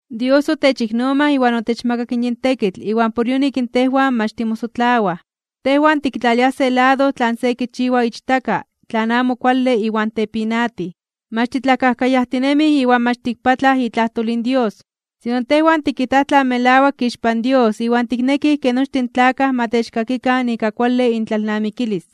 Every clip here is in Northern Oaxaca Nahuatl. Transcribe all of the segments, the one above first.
Dios otechiknomaj iwan otechmakak yin tekitl iwan por yonik tejwan mach timosotlawaj. Tejwan tiktlaliaj se lado tlan se kichiwa ichtaka tlan amo kuale iwan tepinatij, mach titlakajkayajtinemij iwan mach tikpatlaj itlajtol in Dios. Sino tejwan tikijtaj tlan melawak ixpan Dios iwan tiknekij ke nochtin in tlakaj ma techkakikan ika kuale intlalnamikilis.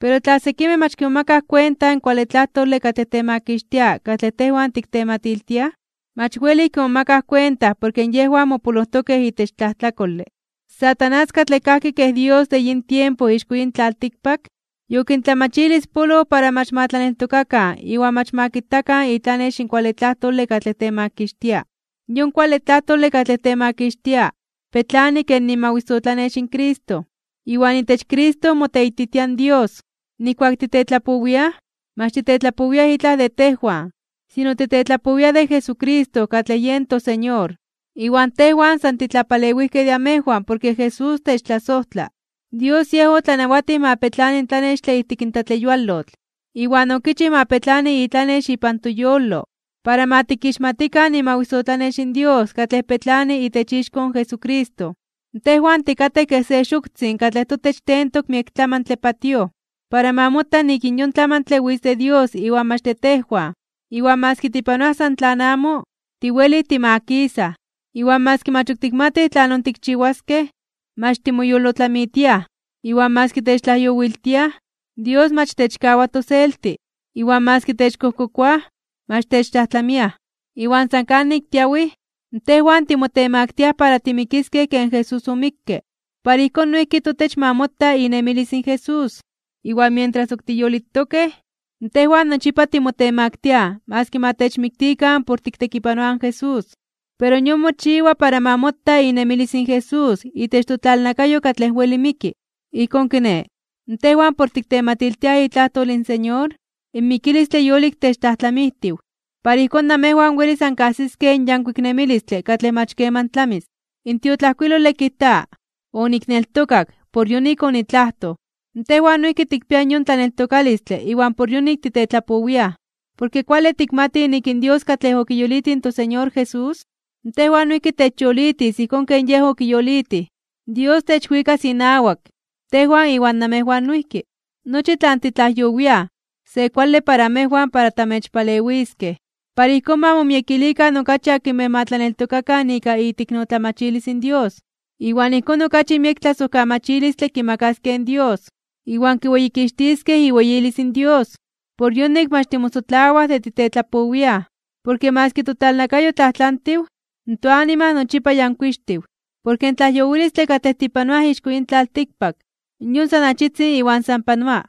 Pero tla sekimej mach kimomakaj kuenta in kuale tlajtole katlej temakixtia katlej tejwan tiktematiltiaj, mach welij kimomakaj kuenta porke yejwan mopolojtokej itech tlajtlakole. In Satanás katlej kajki kej dios de yin tiempo ixko yin tlaltikpak, yokintlamachilispoloj para mach ma tlaneltokakan iwan mach ma kitakan itlanex in kuale tlajtole katlej temakixtia. Yon kuale tlajtole katlej temakixtia petlani ken imawisotlanex in Cristo. Iwan itech Cristo moteititia in Dios. Nijkuak titetlapowiaj, mach titetlapowiaj itlaj de tejwan, sino titetlapowiaj de Jesucristo katlej yen toSeñor. Iwan tejwan san titlapalewijkej de amejwan porke Jesús techtlasojtla. Dios Yej otlanawatij ma petlani in tlanextle ijtik tlatleyualotl, iwan okichij ma petlani itlanex ipan toyolo, para ma tikixmatikan imawisotlanex in Dios katlej petlani itech ixko in Jesucristo. Tejwan tikatej kej se xoktzin katlej totech tentok miek tlamantle patíoj, para ma mota nik yon tlamantle witz de Dios iwan mach de tejwan. Iwan maski tipanoaj san tlan amo, tiwelij timakisaj. Iwan maski mach ok tikmatij tlanon tikchiwaskej, mach timoyolotlamitiaj. Iwan maski techtlajyowiltiaj, Dios mach techkawa toselti. Iwan maski techkojkokoaj, mach techtlajtlamiaj. Iwan san kanik tiawij, tejwan timotemaktiaj (timotemaktiliaj) para timikiskej ken Jesús omikke, para ijkón noijki totech ma mota inemilis in Jesús. Iwan mientras ok tiyolitokej, tejwan nochipa timotemaktiaj maski ma techmiktikan por tiktekipanoaj in Jesús. Pero yon mochiwa para ma mota inemilis in Jesús itech totlalnakayo katlej weli miki. Ijkón kiné, tejwan por tiktematiltiaj itlajtol in Señor, in mikilistle yolik techtlajtlamijtiw, para ijkón namejwan welis ankajsiskej in yankuik nemilistle katlej mach keman tlamis. In tiotlajkuilole kijta: “Onikneltokak, por yonik onitlajtoj.” Tejwan noijki tikpiaj yon tlaneltokalistle iwan por yonik titetlapowiaj. Porke kuale tikmatij nik in Dios katlej okiyolitij in toSeñor Jesús, tejwan noijki techyolitis ijkón ken Yej okiyolitij. Dios techwikas inawak, tejwan iwan namejwan noijki. Nochi tlan titlajyowiaj, se kuale para amejwan para tamechpalewiskej. Para ijkón ma momiekilikan okachi akinmej ma tlaneltokakan ika iteiknotlamachilis in Dios, iwan ijkón okachi miek tlasojkamachilistle kimakaskej in Dios, iwan kiweyikixtiskej iweyilis in Dios. Por yonik mach timosotlawaj de titetlapowiaj, porke maski totlalnakayo tlajtlantiw, toanima nochipa yankuixtiw. Porke in tlajyowilistle katlej tipanoaj ixko yin tlaltikpak, yon san achitzin iwan san panoa.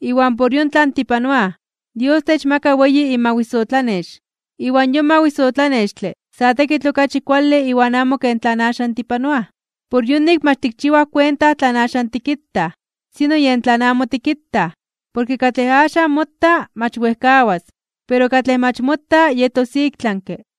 Iwan por yon tlan tipanoaj, Dios techmakas weyi tomawisotlanex. Iwan yon mawisotlanextle sa tekitl okachi kuale iwan amo ken tlan axan tipanoaj. Por yonik mach tikchiwaj kuenta tlan axan tikitaj, sino yen tlan amo tikitaj. Porke katlej axan mota mach wejkawas, pero katlej mach mota yetos iktlanke (ik tlami).